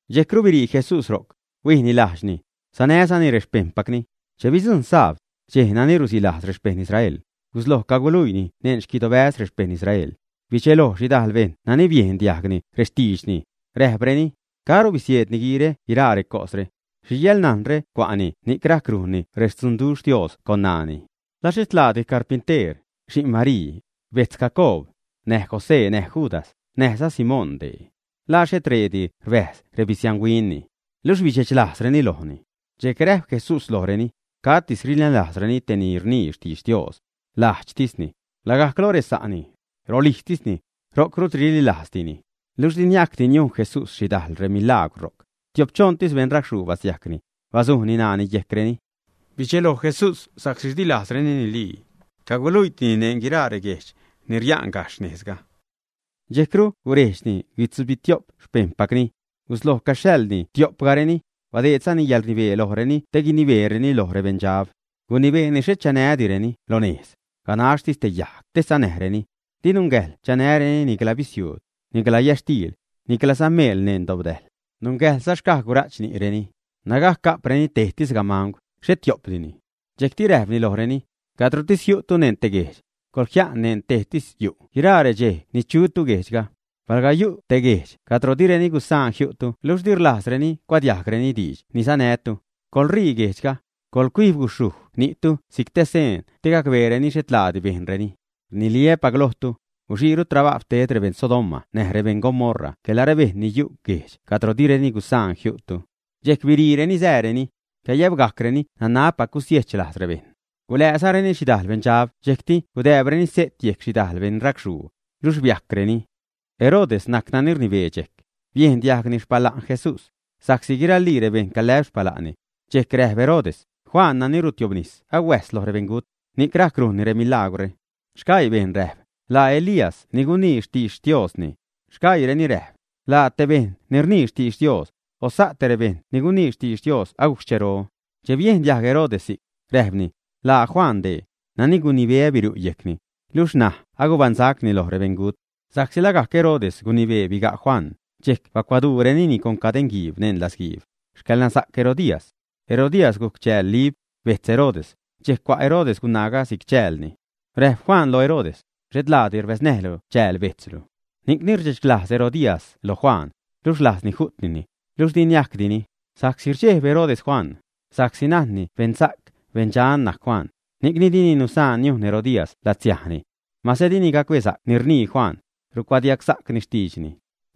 Dxejcru birii Jesús ro'c, huijni lajdxni, sanäzani rexpejṉpacni. Che bidzujṉ sabd, dxej nani rusilajz rexpejṉ Israel, gusloj caguluiini neṉ xquidobäz rexpejṉ Israel. Bidxeloj xhidajl bejṉ nani biejn diajg rextiidxni, räjpreni: ―¿Caro bisieed niguiire guiraa recosre? ¿Xhi yäḻnajnre cua'ni ni'c rajc rujnni rextzunduxh Dios con ṉaani? ¿La xhet laadi carpinteer, xi'n Marii, bejtz Jacoob, näj José, näj Judas, näjza Simón dee, ä? ¿La xhet reedi rbäjz rebisianhuinni? Luxh bidxechlajzreni lojni. Dxejc räjp Jesús lojreni: ―Catis rinälajzreni te ni rnii xtidx Dios. Lajdxtisni, lagajc loj resa'ni, rolijztisni, ro'c rut rinälajzdini. Luxh di niajcdi niujn Jesús xhidajl milaagwr ro'c. Tiopchoṉtis beṉracxhuu basiajcni, bazujni ṉaani yejcreni. Bidxelo Jesús sa'csi di lajzreni nilii. Caguluiitini neṉ guiraa reguejdxe' ni ria'n gajxh nejzga. Dxejcru gurejdxni guitzubitio'p xpejṉpacni. Gusloj caguxhaḻni tiopgajreni; badeedzani yäḻrnibee lojreni te guinibeereni loj rebeṉdxab. Gunibeeni xhet chanädireni lo nejz, ganaxhtis te yajg te sanäjreni. Di nungäjḻ chanäreni nicla bisiuud, nicla yätxtiil, niclaza meel neṉ dobdäjl. Nungäjḻza xcaj gura'ch ni'reni, nägajc ga'preni tejtis gamangw, xhet tio'pdini. Dxejcti räjpni lojreni: ―Cadrotis jiu'tu neṉ te guejdx, coḻjia'n neṉ tejtis yu' guiraa redxej ni chutu guejdxga. Palga yu' te guejdx cadro direni gusaan jiu'tu luxh di rlajzreni cuadiajgreni diidx ni sanätu, coḻṟii guejdxga, coḻcuijb guxhuj ni'tu si'c te seen te gacbeereni xhet laadi bejnreni. Rniliä́pac lojtu, guxiiru trabajw ted rebeṉ Sodoma näj rebeṉ Gomorra quela rebejṉ ni yu' guejdx cadro direni gusaan jiu'tu. Dxejc biriireni, sääreni. Cayäbgajcreni nanabpac gusiejch lajz rebejṉ. Gulääzareni xhidajl beṉdxab dxejcti gudääbreni se't yejc xhidajl beṉracxhuu, luxh biajcreni. Herodes najc nani rnibee dxejc. Biejn diajgni xpala'n Jesús, sa'csi guiralii rebejṉ calä'p xpala'nni. Dxejc räjp Herodes: ―Juan nani rutiobnis ahuäjs loj rebeṉgut, ni'c rajc rujnni remilagwre. Sgaii bejṉ räjp: ―Laa Elías ni gunii xtidx Diosni. Sgaiireni räjp: ―Laa te bejṉ ni rnii xtidx Dios, o sa' te rebejṉ ni gunii xtidx Dios agujc xchero. Che biejn diajg Herodes si'c, räjpni: ―Laa Juan dee, nani gunibeä biru' yejcni, luxh ṉaj agubaṉsacni loj rebeṉgut. Sa'csi lagajc Herodes gunibee biga' Juan, dxejc bacuaduurenini con cadeṉguiib neṉ latzguiib, xcäḻnasa'c Herodías. Herodías gujc chääl Lib, bejtz Herodes, dxejc cua' Herodes gunaaga si'c chäälni. Räjp Juan loj Herodes: ―Xhet laadi rbäznäjlu chääl bejtzlu. Ni'cni rdxechlajz Herodías loj Juan, luxh rlajzni ju'tnini, luxh di niajcdini sa'csi rdxejb Herodes Juan, sa'csi najnni beṉsa'c, beṉdxan najc Juan, ni'cni dini nusaan niujn Herodías latsiajni. Mase dini gacbesa'c ni rnii Juan, rucuadiagsa'cni xtiidxni.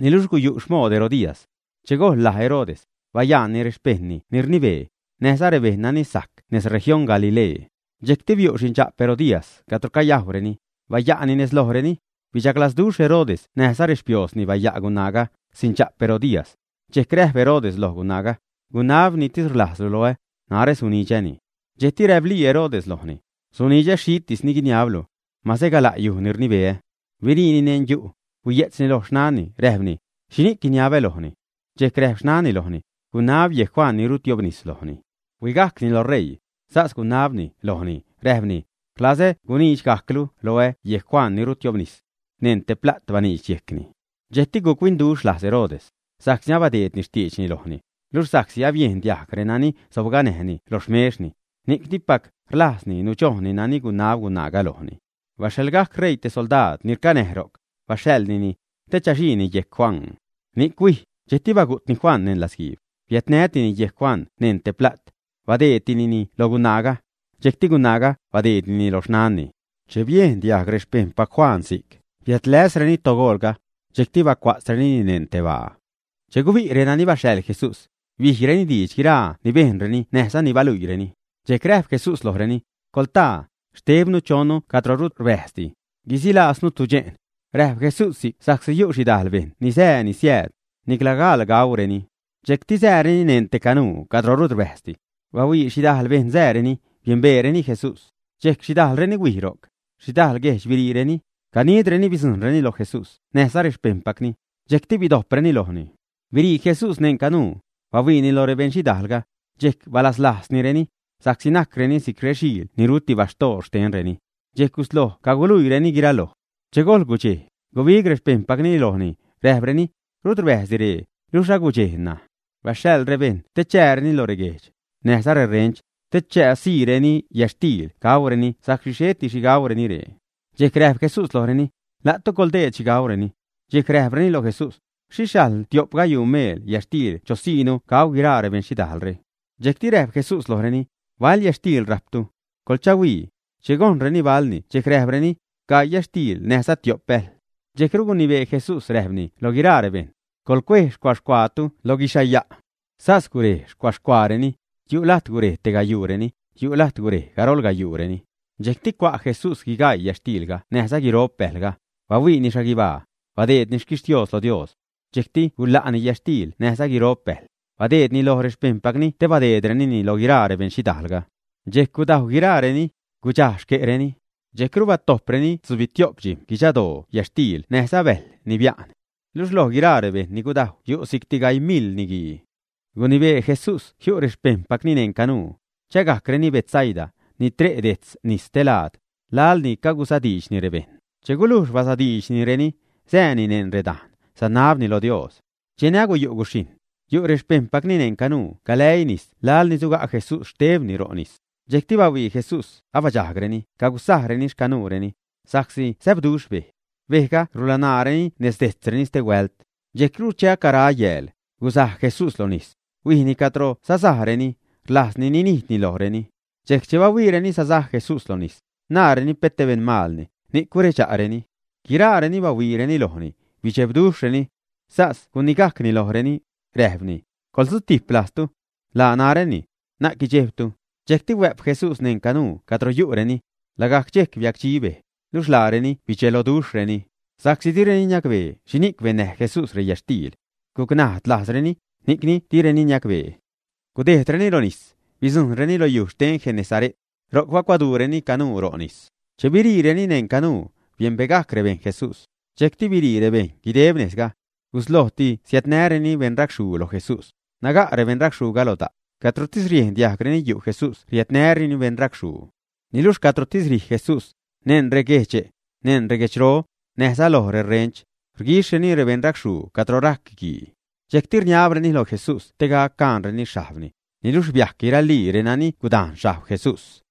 Niluxh guyu' xmood Herodías. Che gojḻ laj Herodes, bayaanni rexpejṉni ni rnibee, näjza rebejṉ nani sajc nez región Galilee. Dxejcti biu' xindxa'p Herodías cadro cayajwreni, baya'ni nez lojreni. Bidxaglazduxh Herodes näjza rexpioozni baya' gunaaga, xindxa'p Herodías. Dxejc räjp Herodes lo gunaaga: ―Gunab ni rlajztislu loä, narä sunidxäni. Dxejcru räplii Herodes lojni: ―Sunidxä xhitis ni guiniablu. Mase gala' yuj ni rnibeä. Biriitini neṉ yu', huiye'tzni loj xnanni, räjpni: ―¿Xhini'c guiniabä lojni? Dxejc räjp xnanni lojni: ―Gunab yejc Juan ni rutiobnis lojni. Huigajcni loj ṟeii, sas gunabni lojni, räjpni: ―Rlazä gunidxgajclu loä yejc Juan ni rutiobnis. Neṉ te pla't baniidx yejcni. Dxejcti guc-huinduxh lajz Herodes, sa'csi abadeedni xtiidxni lojni, luxh sa'csi abiejn diajg renani sobganäjni lo xmexni, ni'c dipac rlajzni nudxojnni nani gunab gunaaga lojni. Baxhaḻgajc ṟeii te soldaad ni rcanäj ro'c, baxhaḻnini, te chaxiini yejc Juan. Ni'c huij, dxejcti bagu'tni Juan neṉ latzguiib, biädnätini yejc Juan neṉ te pla't. Badeedtinini loj gunaaga. Dxejcti gunaaga badeednini loj xnanni. Che biejn diajg rexpejṉpac Juan si'c, biädläsreni togoolga. Dxejcti bacua'tzrenini neṉ te baa. Che gubi' renani baxhaḻ Jesús, bijreni diidx guiraa ni bejnreni näjza ni baluiireni. Dxejc räjp Jesús lojreni: ―Coḻtaa, xtebnu choṉnu cadro rut rbäjzdi, guisilaaznu tudxe'n. Räjp Jesús si'c sa'csi yu' xhidajl bejṉ ni sää, ni siääd, nicla gaḻ gauureni. Dxejcti sääreni neṉ te canuu cadro rut rbäjzdi. Bahuii xhidajl bejṉ sääreni, biembeereni Jesús. Dxejc xhidajlreni huini' ro'c, xhidajl guejdx biriireni, ganidreni bidzujṉreni loj Jesús näjza rexpejṉpacni, dxejcti bidojpreni lojni. Birii Jesús neṉ canuu, bahuiini loj beṉxhidaalga. Dxejc balazlajznireni, sa'csi najcreni si'c rexiil ni ruti baxtoor xtenreni. Dxejc gusloj caguluiinireni guiraloj. Che gojḻ gudxej, gubig rexpejṉpacni lojni, räjpreni: ―Rut rbäjzdi ree, luxh agudxej ṉaj. Baxhaḻ rebejṉ te chääreni lo reguejdx, näjza reṟench, te chasiireni yätxtiil gauureni sa'csi xheti xhi gauureni ree. Dxejc räjp Jesús lojreni: ―La'tu coḻdeed xhi gauureni. Dxejc räjpreni loj Jesús: ―¿Xhixh sajl tiop gayuu meel yätxtiil chosiinu gauu guiraa rebeṉxhidajlre? Dxejcti räjp Jesús lojreni: ―¿Bal yätxtiil rajptu? Coḻchahuii. Che gojnreni balni dxejc räjpreni: ―Gaii yätxtiil, näjza tiop bäjl. Dxejcru gunibee Jesús räjpreni loj guiraa rebejṉ: ―Coḻcuej xcua-xcuaatu loj guixhaya'. Sas gurej xcua-xcuaareni. Yu' lajt gurej tegayuureni, yu' lajt gurej garol gayuureni. Dxejcti cua' Jesús guigaii yätxtiilga näjza guiro'p bäjlga, bahuiini xhaguibaa, badeedni xquixhtios loj Dios. Dxejcti gula'ni yätxtiil näjza guiro'p bäjl, badeednini loj rexpejṉpacni te badeedrenini loj guiraa rebeṉxhidaalga. Dxejc gudajw guiraareni, gudxaj xque'reni. Dxejcru batojpreni tzubitiop dxijm̲ guidxadoo yätxtiil näjza bäjl ni bia'n. Luxh loj guiraa rebejṉ ni gudajw yu' si'cti gaii mil niguii. Gunibee Jesús jiu' rexpejṉpacni neṉ canuu, chägajcreni Betsaida, ni tre' dejtz nis stelaad, laḻni cagusadiidxni rebejṉ. Che gulujx basadiidxnireni, sääni neṉ redane', sanabni lo Dios. Cheni acayu' guxhijṉ, yu' rexpejṉpacni neṉ canuu galäii nis laḻ ni suga' Jesús xtebni ro' nis. Dxejcti bahuii Jesús abadxajgreni cagusajreni xcanuureni, sa'csi säbduxh bej. Bejga rulanaareni nez dejtzreni stehuält. Dxejcru che acara yääl, gusaj Jesús loj nis, huijni cadro sasajreni, rlajzni ninijdni lojreni. Dxejc che bahuiireni sasaj Jesús loj nis, naareni pet te beṉmalni, ni'c guredxa'reni. Guiraareni bahuiireni lojni, bidxebduxhreni. Sas gunigajcni lojreni, räjpni: ―Coḻsutijp lajztu. Laa naräni. Na'c guidxejbtu. Dxejcti huä'p Jesús neṉ canuu cadro yu'reni. Lagajc dxejc biacdxi bej, luxh laareni bidxeloduxhreni, sa'csi direni niacbee xhini'c bennäj Jesús reyätxtiil. Guc najd lajzreni, ni'c direni niacbee. Gudejdreni lo nis, bidzujṉreni lo yuj xten Genesare't. Ro'c bacuaduureni canuu ro' nis. Che biriireni neṉ canuu, biembegajc rebejṉ Jesús, dxejcti birii rebejṉ guideb nejzga. Guslojti siädnäreni beṉracxhuu loj Jesús, naga' rebeṉracxhuuga lo da'. Cadrotis riejn diajgreni yu' Jesús riädnäreni rebeṉracxhuu. Niluxh cadrotis rij Jesús, neṉ reguedxbäz, neṉ reguedxro, näjza loj reṟench, rguixhreni rebeṉracxhuu cadro rajc guii. Dxejcti rniabreni loj Jesús te gac caanreni xhajbni, niluxh biajc guiralii renani gudajn xhajb Jesús.